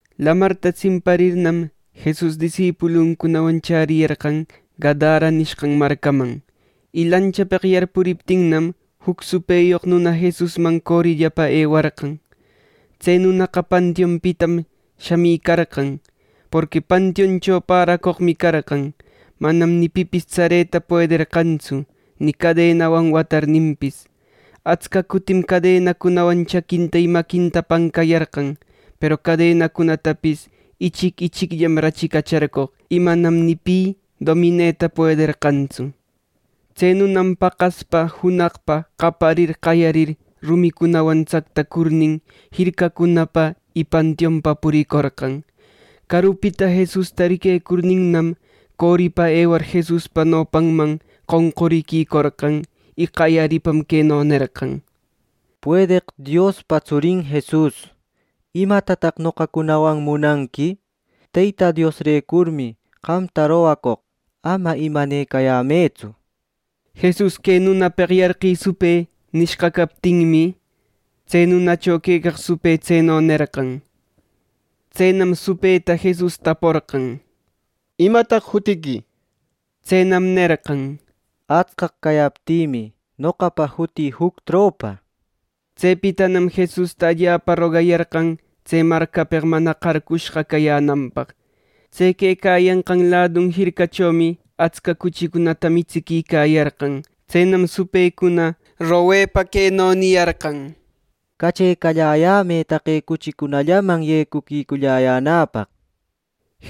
Lamarta tsimparirnam, Jesus disipuluncunawan chäriyarqan Gadara nishqan marcaman. Y lanchapeq yarpuriptinnam, juc supëyoq nuna Jesusman corillapa ewarqan. Tse nunaqa pantiunpitam shamicarqan; porqui pantiuncho päracoqmi carqan. Manam ni pipis tsareta puederqantsu, ni cadenawan watarninpis. Atsca cutim cadenacunawan chaquinta y maquinta pancayarqan. Peru cadenacunatapis ichic ichicllam rachicacharcoq. Y manam ni pi domineta puederqantsu Tse nunam paqaspa junaqpa qaparir qayarir rumicunawan tsactacurnin, jircacunapa y pantiunpa puricorqan. Carupita Jesusta riquecurninnam, coripa ewar Jesuspa nopanman qonquriquicorqan. Y qayaripa queno nerqan: —Puedeq Diospa tsurin Jesus, ¿imatataq noqacunawan munanqui! ¡Teyta Diosrecurmi qamta rogacoq ama imanecayämëtsu! —nir. Jesus, “¡Que nunapeq yarqï supë!” nishqa captinmi, tse nunacho quecaq supë tseno nerqan. Tsenam supëta Jesus taporqan: —¿Imataq jutiqui? —nir. Tsenam nerqan: —Atscaq cayaptïmi, noqapa jutï “Juc Tropa” nir. Tsepitanam Jesusta allapa rogayarqan tse marcapeq mana qarqushqa cayänanpaq. Tse quecayanqan ladun jircachomi atsca cuchicunata mitsiquicayarqan. Tsenam supëcuna mañepa, queno niyarqan: —¡Cachecalläyämë taqe cuchicunallaman yecuquiculläyänäpaq! —nir.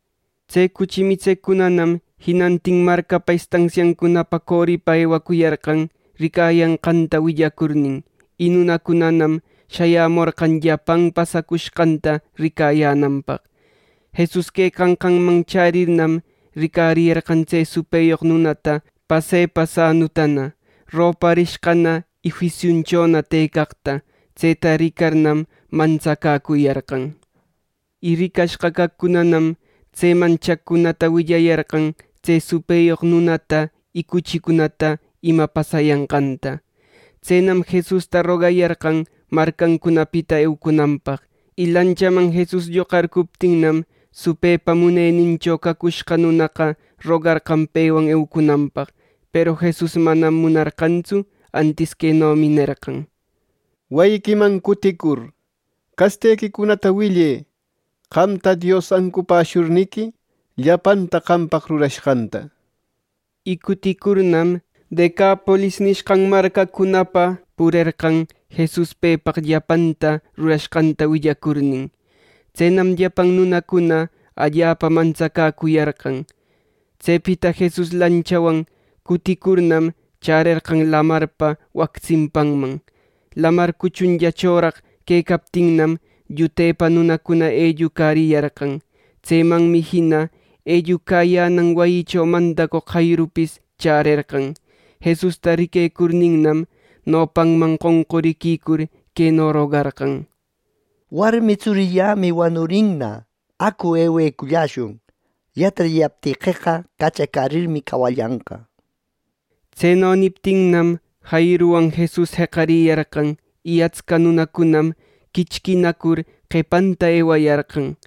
Tse cuchi mitseqcunanam jinantin marcapa estansiancunapa coripa ewacuyarqan, ricayanqanta willacurnin. Y nunacunanam shayämorqan llapan pasacushqanta ricayänanpaq. Jesus quecanqanman chärirnam, ricariyarqan tse supëyoq nunata pasepa sanutana, roparishqana y juisiunchona tëcaqta. Tseta ricarnam mantsacäcuyarqan. Y ricashqa caqcunanam tseman chaqcunata willayarqan tse supëyoq nunata y cuchicunata ima pasayanqanta. Tsenam Jesusta rogayarqan marcancunapita eucunanpaq. Y lanchaman Jesus lloqacurcuptinnam, supëpa munenincho cacushqa nunaqa rogarqan pewan eucunanpaq. Peru Jesus manam munarqantsu antis quenomi nerqan: —Wayiquiman cutïcur castequicunata willë qamta Dios ancupäshurniqui llapanta qampaq rurashqanta. Y cuticurnam, Decapolis nishqan marcacunapa purerqan Jesus pepaq llapanta rurashqanta willacurnin. Tsenam llapan nunacuna allapa mantsacäcuyarqan. Tsepita Jesus lanchawan cuticurnam, chärerqan lamarpa wac tsimpanman. Lamar cuchunllachoraq quecaptinnam, llutepa nunacuna ellucariyarqan. Tsemanmi jina ellucayänan wayicho mandacoq Jairupis chärerqan. Jesusta riquecurninnam, nopanman qonquriquicur, queno rogarqan: —Warmi tsurillämi wanurinna. Acu, eweculläshun. Yatarillaptiqueqa, cachacärirmi cawallanqa —nir. Tseno niptinnam, Jairuwan Jesus jeqariyarqan, y atsca nunacunam quichquinacur qepanta ewayarqan.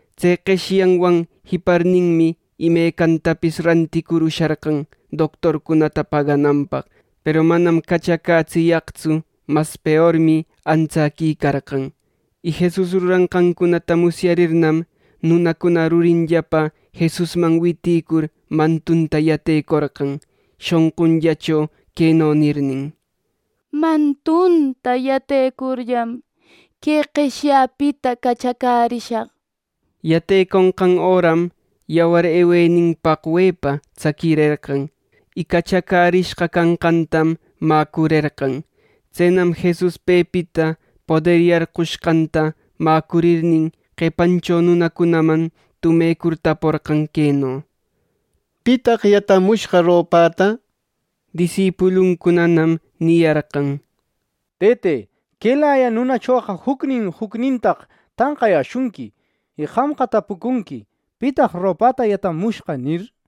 Tse qeshyawan jiparmi imecancunatapis ranticur usharqan doctorcunata pagananpaq, peru manam cachacätsiyaqtsu mas peormi antsäquicarqan. Y Jesus ruranqancunata musyarirnam, nunacuna rurinllapa Jesusman witïcur mantunta yatecorqan, shonqunllacho queno nirnin: —Mantunta yatecurllam que qeshyapita cachacärishaq —nir. Yateconqan öram yawar ewenin paqwepa tsaquirerqan, y cachacärishqa canqantam mäcurerqan. Tsenam Jesus pepita poder yarqushqanta mäcurirnin, qepancho nunacunaman tumecur taporqan queno: —¿Pitaq yatamushqa ropäta? —nir. Disipuluncunanam niyarqan: —¡Tëte, quelaya nunachoqa jucnin jucnintaq tanqayäshunqui! Y qamqa tapucunqui: ‘¿Pitaq ropäta yatamushqa?’ —nir.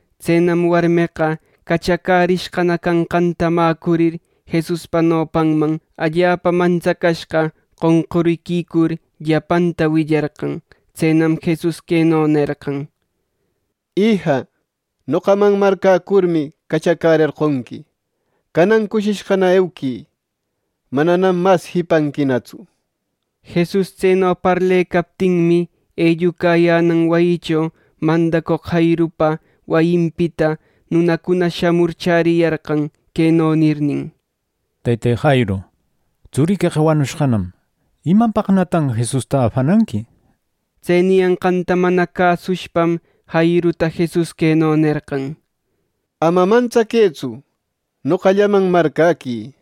Tsenam warmeqa cachacärishqa canqanta mäcurir, Jesuspa nopanman allapa mantsacashqa qonquriquicur, llapanta willarqan. Tsenam Jesus queno nerqan: —Ija, noqaman marcäcurmi cachacärerqonqui. Canan cushishqana euquï. Mananam mas jipanquinatsu. Jesus tseno parlecaptinmi, ellucayänan wayicho mandacoq Jairupa wayinpita nunacuna shamur chäriyarqan queno nirnin: —Tëte Jairu, tsuriqueqa wanurishqanam. ¿Imapaqnatan Jesusta afananqui! —nir. Tse niyanqanta mana cäsushpam Jairuta Jesus queno nerqan: —Ama mantsaquëtsu. Noqallaman marcäquï.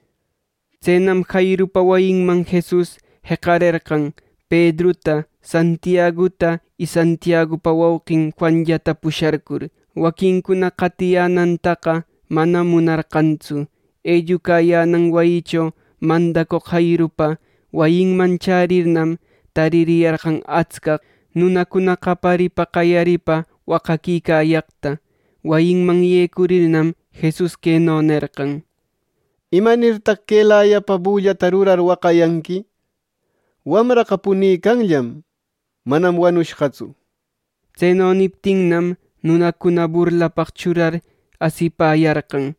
Tsenam Jairupa wayinman Jesus jeqarerqan Pedruta, Santiaguta y Santiagupa wauqin Juanllata pusharcur. Waquincuna qatiyänantaqa manam munarqantsu. Ellucayänan wayicho mandacoq Jairupa wayinman chärirnam, taririyarqan atscaq nunacuna qayaripa, qayaripa waqaquicayaqta. Wayiman yecurirnam, Jesus queno nerqan: —¿Imanirtaq quelayapa bullata rurar waqayanqui! Wamraqa punicanllam. Manam wanushqatsu —nir. Tseno niptinnam, nunacuna burlapaq churar asipäyarqan.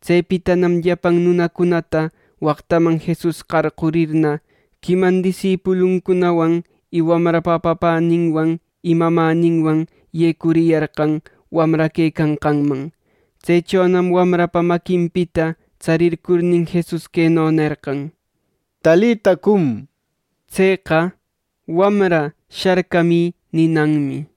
Tsepitanam llapan nunacunata waqtaman Jesus qarqurirna, quiman disipuluncunawan y wamrapa papäninwan y mamäninwan yecuriyarqan wamra quecanqanman. Tsechonam wamrapa maquinpita tsarircurnin, Jesus queno nerqan: —Talita cum —nishpa. (Tseqa: “Wamra, sharcamï” ninanmi).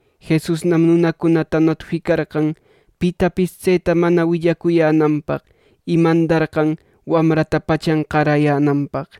Jesusnam nunacunata notificarqan pitapis tseta mana willacuyänanpaq, y mandarqan wamrata pachan qarayänanpaq.